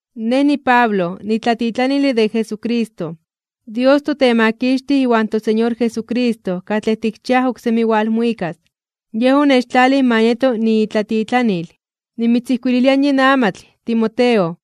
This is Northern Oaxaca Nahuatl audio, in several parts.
Nej niPablo, nitlatitlanile de Jesucristo. Dios toTemakixtij iwan toSeñor Jesucristo katlej tikchiaj oksemi walmuikas, Yej onechtlalij ma nieto niitlatitlanil. Nimitzijkuililia yin amatl, Timoteo,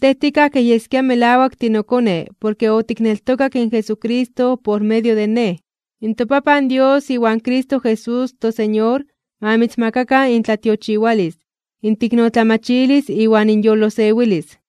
tej tikaj kej yeskia melawak tinokone porke otikneltokak in Jesucristo por medio de nej. ToPapan Dios iwan Cristo Jesús in toSeñor ma mitzmakakan intlatiochiwalis, inteiknotlamachilis iwan inyolosewilis.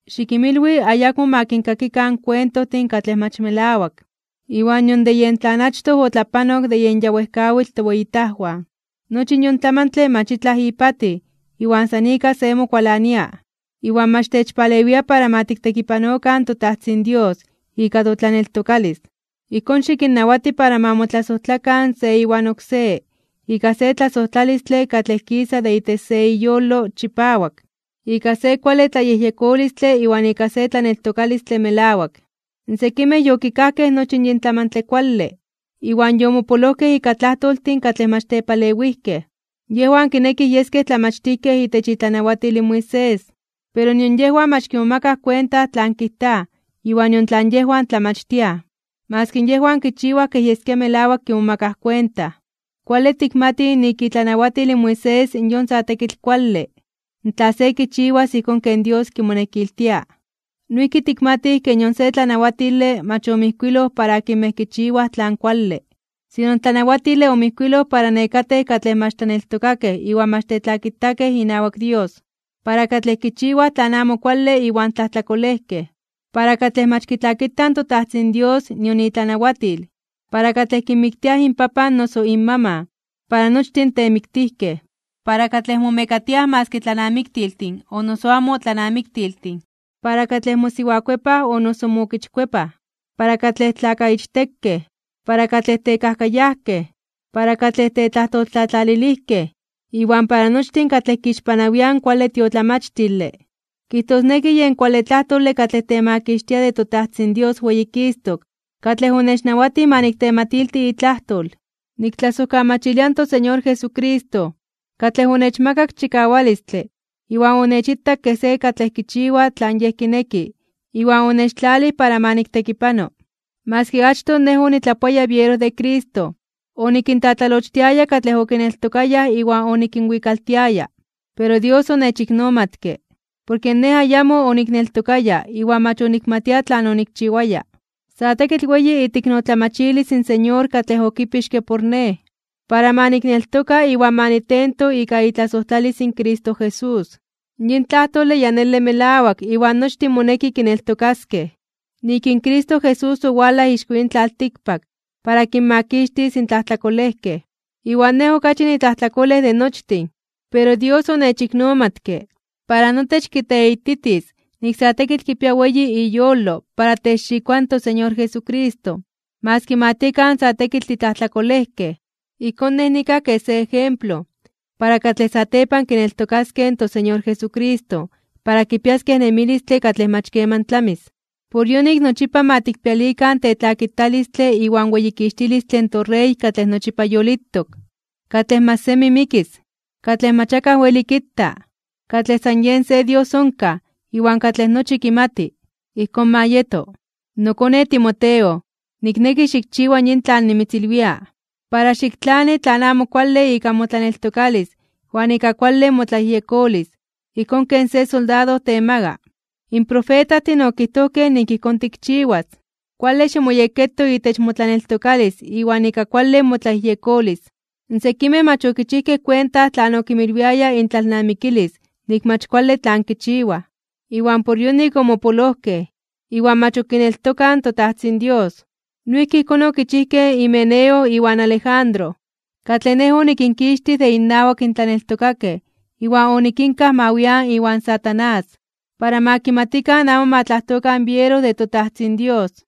Xikinmilwi ayakmo ma kinkakikan kuentojtin katlej mach melawak, iwan nion de tlan achtoj otlapanok de yen ya wejkawitl toweyitajwan. Nochi yon tlamantle mach itlaj ipatij iwan san ika se mokualania, iwan mach techpalewia para ma tiktekipanokan toTajtzin Dios ika totlaneltokalis. Ijkón xikinnawati para ma motlasojtlakan se iwan oksé ika se tlasojtlalistle katlej kisa de itech se iyolo chipawak, ika se kuale tlayejyekolistle iwan ika se tlaneltokalistle melawak. Sekimej yokikajkej nochi yin tlamantle kuale, iwan yomopolojkej ika tlajtoltin katlej mach tepalewijkej. Yejwan kinekij yeskej tlamachtijkej itech itlanawatil in Moisés, pero nion yejwan mach kimomakaj kuenta tlan kijtaj iwan nion tlan yejwan tlamachtiaj, maski yejwan kichiwaj kej yeskia melawak kimomakaj kuenta. Kuale tikmatij nik itlanawatil in Moisés yon sa tekitl kuale, tla se kichiwas ijkón ken Dios kimonekiltia. Noijki tikmatij ke nion se tlanawatile mach omijkuiloj para akinmej kichiwaj tlan kuale. Sino in tlanawatile omijkuiloj para nekatej katlej mach tlaneltokakej iwan mach tetlakitakej inawak Dios, para katlej kichiwaj tlan amo kuale iwan tlajtlakolejkej, para katlej mach kitlakitaj toTajtzin Dios nion itlanawatil, para katlej kinmiktiaj inpapan o noso inmaman, para nochtin in temiktijkej, para katlej momekatiaj maski tlanamiktiltin o noso amo tlanamiktiltin, para katlej mosiwakuepaj o noso mookichkuepaj, para katlej tlakaichtekej, para katlej tekajkayajkej, para katlej tetlajtoltlatlalilijkej, iwan para nochtin katlej kixpanawiaj in kuale tiotlamachtile, kijtosneki yen kuale tlajtole katlej temakixtia de toTajtzin Dios weyikistok (weyititok) katlej onechnawatij ma niktematilti itlajtol. Niktlasojkamachilia in toSeñor Jesucristo, katlej onechmakak chikawalistle iwan onechitak kej se katlej kichiwa tlan Yej kineki iwan onechtlalij para ma niktekipano. Maski achtoj nej onitlapoaya biero de Cristo, onikintlatlalochtiaya katlej okineltokayaj iwan onikinwikaltiaya. Pero Dios onechiknomatke, porke nej ayamo onikneltokaya iwan mach onikmatia tlan onikchiwaya. Sa tekitl weyi iteiknotlamachilis in Señor katlej okipixke por nej, para ma nikneltoka iwan ma nitento ika itlasojtlalis in Cristo Jesús. Yin tlajtole ya nele melawak iwan nochtin moneki kineltokaskej, nik in Cristo Jesús owalaj ixko yin tlaltikpak para kinmakixtis in tlajtlakolejkej, iwan nej, okachi nitlajtlakolej de nochtin. Pero Dios onechiknomatke, para notech kiteititis nik sa tekitl kipia weyi iyolo para techxikoa in toSeñor Jesucristo maski ma tiekan sa tekitl titlajtlakolejkej. Ijkón, nej nikaj kej se ejemplo para katlej satepan kineltokaskej in toSeñor Jesucristo para kipiaskej in nemilistle katlej mach keman tlamis. Por yonik nochipa ma tikpialikan tetlakitalistle iwan weyikixtilistle in toRey katlej nochipa yolitok, katlej mach semi mikis, katlej mach akaj weli kita, katlej san Yej se Dios onkaj iwan katlej nochi kimati. Ijkón ma yeto. Nokone Timoteo, nikneki xikchiwa yin tlan nimitzilwia, para xiktlani tlan amo kuale ika motlaneltokalis iwan ika kuale motlayejyekolis ijkón ken se soldado temaga (temaka). In profetajtin okijtojkej nik ijkón tikchiwas. Kuale ximoyekketo itech motlaneltokalis iwan ika kuale motlayejyekolis. Sekimej mach okichijkej kuenta tlan okinmilwiaya intlalnamikilis nik mach kuale tlan kichiwaj, iwan por yonik omopolojkej, iwan mach ok kineltokaj in toTajtzin Dios. Noijki ijkón okichijkej Himeneo iwan Alejandro, katlej nej onikinkixtij de innawak in tlaneltokakej iwan onikinkaj ma wian iwan Satanás, para ma kimatikan amo ma tlajtokan biero de toTajtzin Dios.